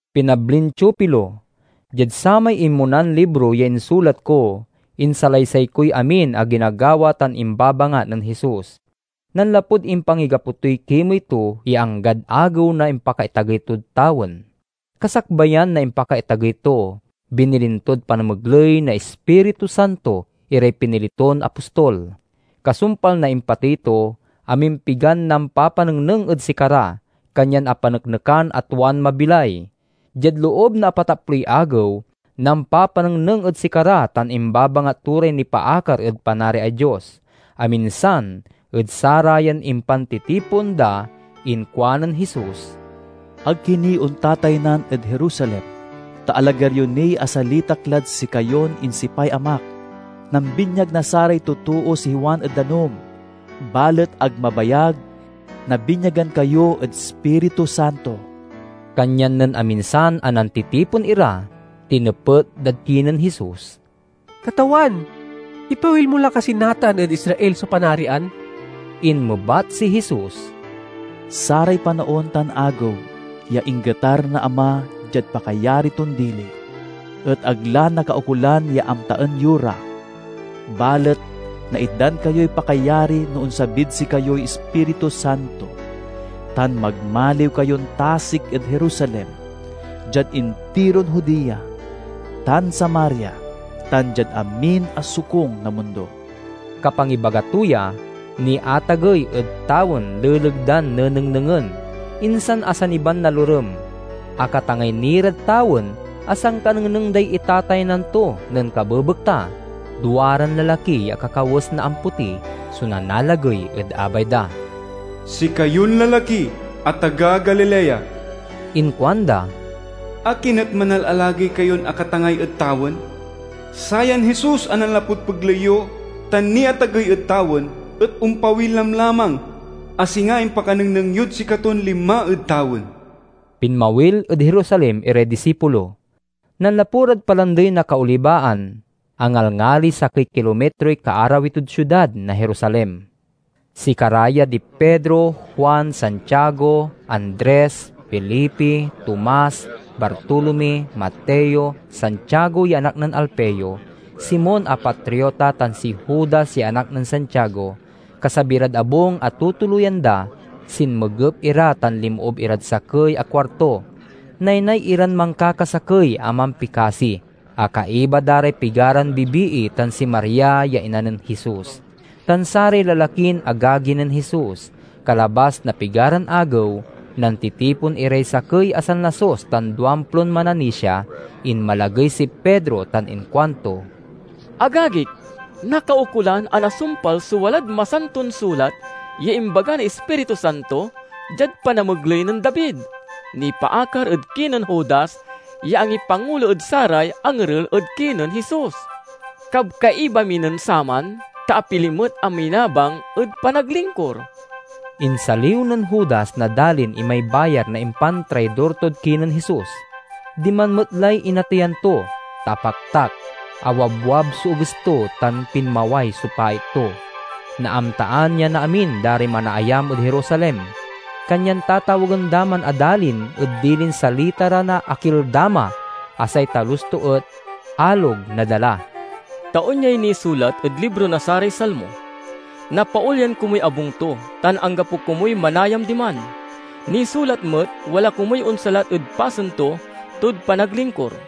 Pinablin Teofilo: Diad samay inmonan libro ya insulat ko, insalaysay koy amin a ginagawa tan imbabangat nen Jesus, nanlapud impangigapo toy kimey to ya anggad agew na impakaitagey tod tawen. Kasakbayan na impakaitagey to, binilin tod panamegley na Ispiritu Santo iray pinili ton apostol. Kasumpal na impatey to, amimpigan nampapanengneng ed sikara, kanyan apaneknekan a tuan mabilay. Diad loob na apataploy agew, nampapanengneng ed sikara tan imbabangat to ray nipaakar ed Panariay Dios. Aminsan ed sarayan impantitipon da inkuanen Jesus, "Ag ki ni ontataynan ed Jerusalem, ta alagar yo niy asalitak lad sikayon insipay Amak. Nambinyag na saray totoo si Juan ed danum, balet ag mabayag, nabinyagan kayo ed Ispiritu Santo." Kanyan nen aminsan a nantitipon ira, tinepet dad kinen Jesus, "Katawan, ipawil mo la kasi natan ed Israel so Panarian?" Inmebat si Jesus, "Saray panaon tan agew ya inggetar na Ama diad pakayari ton dili, et ag la nakaukolan ya amtaen yo ra. Balet naitdan kayoy pakayari no onsabid sikayoy Ispiritu Santo, tan magmaliw kayon tasik ed Jerusalem, diad intiron Judea tan Samaria, tan diad amin a sokung na mundo." Kapangibaga to ya, niatagey ed tawen leleg dan nenengnengen, insan asaniban na lorem. Akatangay ni rad tawen a sankanengneng day itataynan to nen kabebekta, duaran lalaki ya akakawes na ampoti so nanalagey ed abay da. "Sikayon lalaki a taga Galilea," inkuanda, "akin et manalalagey kayon akatangay ed tawen? Sayan Jesus a nanlapud pegley yo tan niatagey ed tawen, et ompawil lamlamang a singa impakanengneng yod sikaton linma ed tawen." Pinmawil ed Jerusalem iray disipulo. Nanlapu rad Palandey na Kaolibaan, a ngalngali sakey kilomitroy kaarawi tod siudad na Jerusalem. Sikara ya di Pedro, Juan, Santiago, Andres, Felipe, Tomas, Bartolome, Mateo, Santiago ya anak nen Alfeo, Simon a Patriota, tan si Judas ya anak nen Santiago. Kasabi rad abung a tutuloyan da, sinmegep ira tan linmoob irad sakey a kuarto. Naynay iran mankakasakey a mampikasi, a kaiba da ray pigaran bibii tan si Maria ya ina nen Jesus, tan saray lalakin agagi nen Jesus. Kalabas na pigaran agew, nantitipon iray sakey a sanlasus tan duamplon mananisia. Inmalagey si Pedro tan inkuanto, "Agagik, nakaukolan a nasumpal so walad Masantod Sulat ya imbaga na Ispiritu Santo, diad panamegley nen David, nipaakar ed kinen Judas ya angipangulo ed saray angerel ed kinen Jesus. Kabkaiba mi nen saman, ta apili met a minabang ed panaglingkur." (Insaliw nen Judas na dalin imay bayar na impantraidor tod kinen Jesus. Diman met lay inateyan to, ta apaktak, awabwab so eges to, tan pinmaway so pait to. Naamtaan ya na amin da ray manaayam ed Jerusalem, kanyan tatawagen da man a dalin ed dilin salita ra na Akeldama, a say talus to et "Alog na Dala.") "Ta onyay nisulat ed libro na saray Salmo: 'Napaolyan komuy abung to, tan anggapo komuy manayam diman.' Nisulat met, 'Wala komuy onsalat ed pasen to tod panaglingkur.'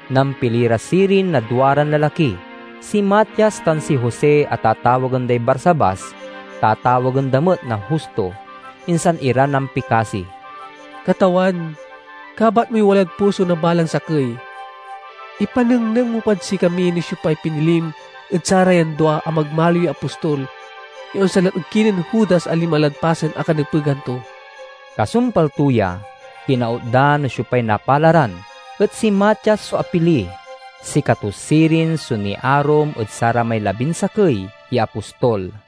Nampili ra sirin na duaran lalaki: si Matias tan si Jose a tatawagen day Barsabas (tatawagen da met na Justo). Insan ira nampikasi, "Katawan, kabat moy walad puso na balang sakey. Ipanengneng mo pad sikami no siopay pinilim ed sarayan dua a magmaliw ya apostol ya onsalat ed kinen Judas a linma lad pasen a kanepegan to." Kasumpal to ya, kinaut da no siopay napalaran, et si Matias so apili. Sikato sirin so niarum ed saramay labinsakey ya apostol.